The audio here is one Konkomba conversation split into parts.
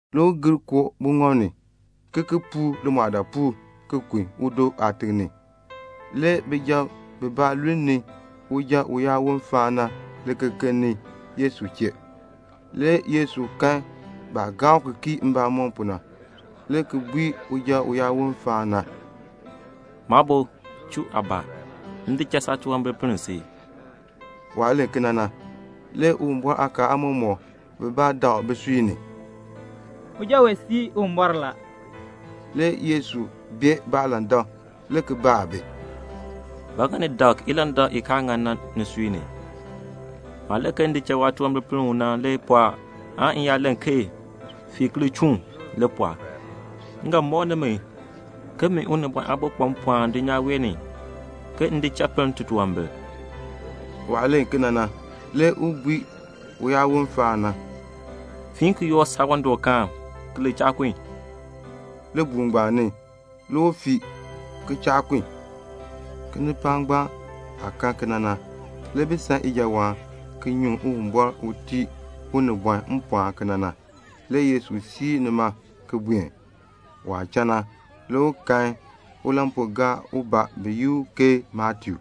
Le u gir koo buŋɔb ni, le ki ki puur limɔɔdaapuul ki kun udo aatiŋ ni. Le bijab bibaa lulni uja uyaawon faan na likekeln ni Yesu chee. Le Yesu kan baah gaa u ki kii mbamɔm pu na, le ki bui uja uyaawon faan na, "Maabo, chuu aabaa, m di cha saatunwambir ki pinn si." Waah len kena na, le Uwumbɔr aakaal aamɔmɔkb bibaa dak bisui ni, "Uja wee sii Uwumbɔr la." Le Yesu bee baalandak, le ki baa bi, "Ba ŋa ni dak ilandak i kaa ŋan na nisui ni? Maah len ke m di cha waatunwambir ki pinn u na le pɔɔ aan m yaa len ke 'Fiin ki li chuun' li pɔɔ? M ga mɔk nimi ke min Unibɔn Aabo kpa mpɔɔn dulnyaa wee ni ke m di cha pinn titunwambir." Waah len kena na, le u bui uyaawon faan na, "Fiin ki yoor saawandɔkaan ki li cha kun." Libuul ngbaan ni le u fii ki cha kun. Kinipaak ngbaan aah kan kena na, le bi san ijawaan, ki nyuŋ Uwumbɔr u tii unibɔn mpɔɔn kena na. Le Yesu siir nima ki buen. Waah cha na, le u kan ulampuugaar ubaa bi yi u ke Matiu.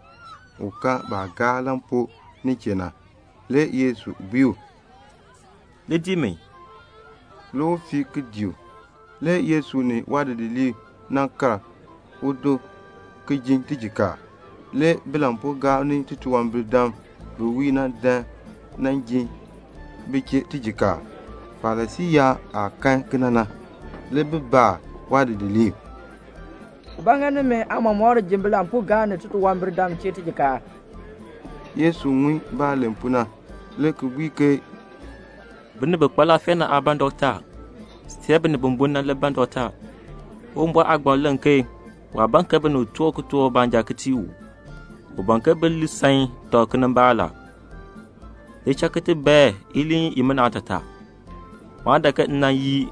U ka baah gaar lampuu nin chee na. Le Yesu bui u, "Li dii mi." Le u fii, le ki dii u. Le Yesu ni waadidiliib nan kal udo ji tijikaar. Le bilampuugaab ni titunwambirdam bi wiir na dan nan ji bi chee tijikaar. Farisii yaab aah kan kena na, le bi baa waadidiliib, "Ba ŋa nimi aatiicha ji bilampuugaab ni titunwambirdam chee tijikaar?" Le Yesu ŋun baah len pu na le ki bui ke "Binib bi kpa laafee na aa ban dɔkta, see binib bi bun na le ban dɔkta. Uwumbɔr aagbaŋ len ke waa ban ke binib toor kitork baanja ki tii u. U ban ke bi li san tɔb kinimbaak. Li cha ki ti bae iliin imina aatataa. Maa dan ke m nan yi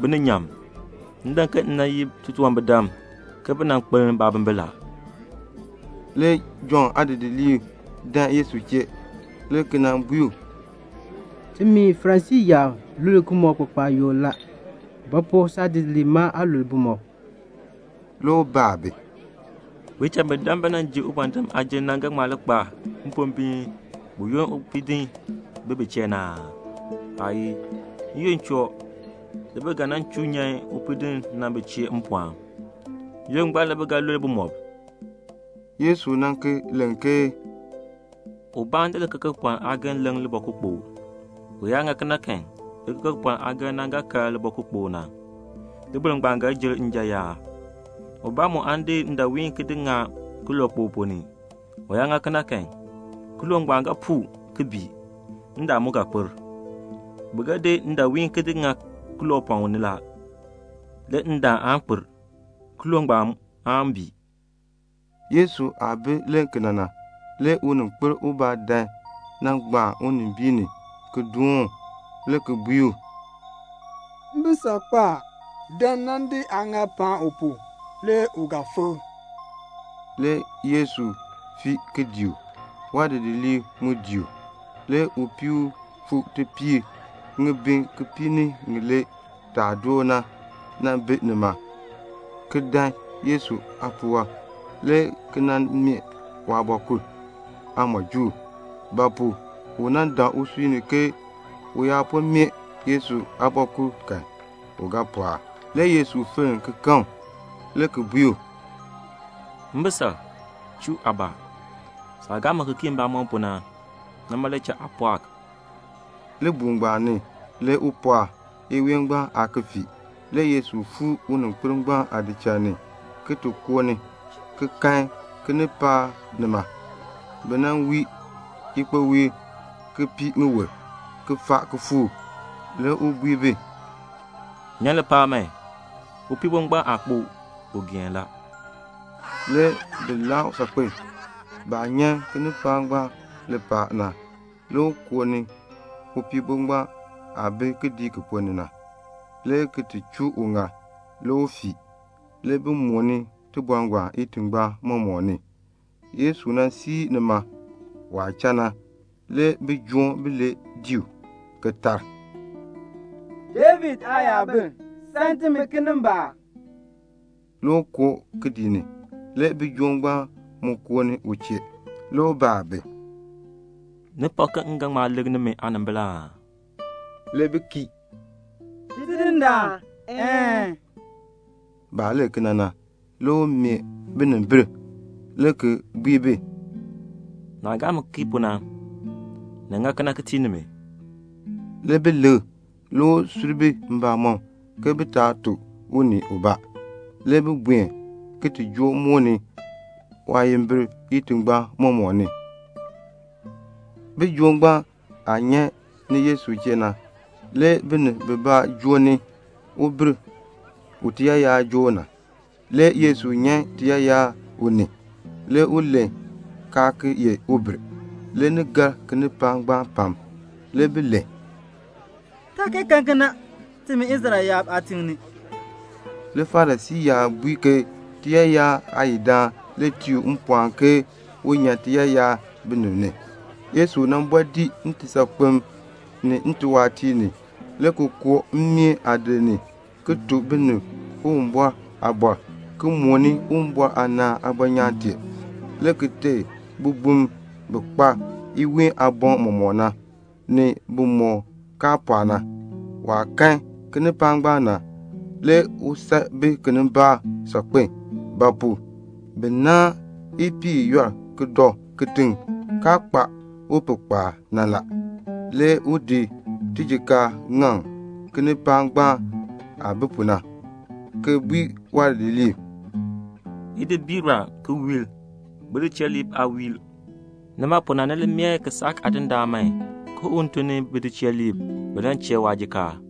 bininyaan. M dan ke m nan yi titunwambirdam ke bi nan kpeln baabimbin." Le Jɔnn aadidiliib dan Yesu chee, le ki nan bui u, "Ti ni Farisii yaab lul bumɔb kpakpaayuk la. Ba pu saadidiliib ma aa lul bumɔb?" Le u baa bi, "Bicham bi dan bi nan ji ubɔndinn aajim na ga ŋma li kpa mpombiin buyoonn upiidinn bi bi chee na aa? Aayii. N-yoonn choo, le bi ga chuu nyan upiidinn na bi chee mpɔɔn. N-yoonn ngbaan le bi ga lul bumɔb." Le Yesu ki len ke "Ubaa aan di likekepɔln aageln ki di leŋ libɔkukpokl. U yaa ŋa kena kan, likekepɔln aageln na ga kar libɔkukpokl na. Liboln ngbaan ga jer njan yaan. Ubaa mu aan di ndaawiin ki di ŋa kilookpok ponn ni. U yaa ŋa kena kan, kilook ngbaan ga puu, ki bii. Ndaan mu ga kpir. Bi ga di ndaawiin ki di ŋa kiloopɔŋ ni la. Le ndaan aan kpir. Kilook ngbaan aan bii." Yesu aah bi len kena na, le uninkpil ubaa dan nan gbaan unimbiin ni ki doon u, le ki bui u, "Mbisal kpo a. Dan nan di aaŋaal ki paan u pu, le u ga fikr." Le Yesu fii ki dii u. Waadidiliib mu dii u. Le upii ubaa u fuu tipiir ŋibin kipiik ni ŋilee taa door na le nan bi nima, ki dan Yesu aapuwɔb, le ki nan meeh waabɔkul aamɔjuul; ba pu? u dak usui ni ke u yaa po meeh Yesu aabɔkul kan, u ga pɔɔk. Le Yesu fenn ki kan u, le ki bui u, "Mbisal, chuu aabaa. Saah gaa mi ki kii mbamɔm pu na, nima le cha aa pɔɔk." Libuul ngbaan ni le u pɔɔk. Iween ngbaan aa ki fii. Le Yesu fuu uninkpil ngbaan aadichal ni, le ki koo ni, ki kan kinipaak nima. Bi wii ikpowiil, ki pii ŋiwul, ki faa kifuuk. Le u bui bi, "Nyan lipaal man. Upiibo ngbaan aa kpo. U geen la." Le bi laa u saakpen. Baah nyan kinipaak ngbaan lipaal na, le u koo ni upiibo ngbaan aah bi kidiik ki ponn ni na, le ki chuu uŋaal. Le u fii. Le bi mooni tibɔr ngbaan itingbaan mɔmɔk ni. Le Yesu siir nima. Waah cha na le bijoom bilee dii u, le ki tar, "David Aayabil, sam timi kinimbaak." Le u koo kidiik ni. Le bijoom ngbaan mu koo ni u chee. Le u baa bi, "Ni pak ke m ga ŋma likr nimi aanimbil aa?" Le bi kii, "Tidindaan, een." Baah len kena na, le u meeh binimbil, le ki bui bi, "Naah gaa mi ki kii pu na, ni ŋa kena ki tii nimi." Le bi likr. Le u sur bi mbamɔm ke bi taa tuk unii ubaa. Le bi buen ki mooni waayimbil itingbaan mɔmɔk ni. Bijoom ngbaan aah nyan ni Yesu chee na, le binib bibaa nan joo ni ubir u tiyaayar joo u na. Le Yesu nyan tiyaayar u ni. Le u len kaa ki ye ubir. Le ni gar kinipaak ngbaan pam. Le bi len, "Taa kee kan kena timi Israel yaab aatiŋ ni." Le Farisii yaab bui ke tiyaayar aayidaan le tii u mpɔɔn ke un ti nyan tiyaayar binib ni. Le Yesu bɔɔ dii ntisaakpem, ni ntiwaatiir ni, le ki koo mmeen aadir ni, ki tuk binib Uwumbɔr aaliin, ki mooni Uwumbɔr aanaan aabɔnyaan tee, le ki teei bibum bi kpa iween aaboŋ mɔmɔk na, ni bimɔk kaa pɔɔ na. Waah kan kinipaak ngbaan na, le u san bi kinimbaak saakpen; ba pu? bi naahn ipiih i yɔl ki dɔ kitiŋ, kaa kpa upihkpaal na. Le u di tijikaar ki di ŋaŋ kinipaak ngbaan aah bi pu na, ki bui waadidiliib, "Idi biir a, ki wiir. Bidicheeliib aa wiir. Nima pu na, ni li mee kisaak Aadindaan man ke un tun bidicheeliib bin ti chee waajikaar."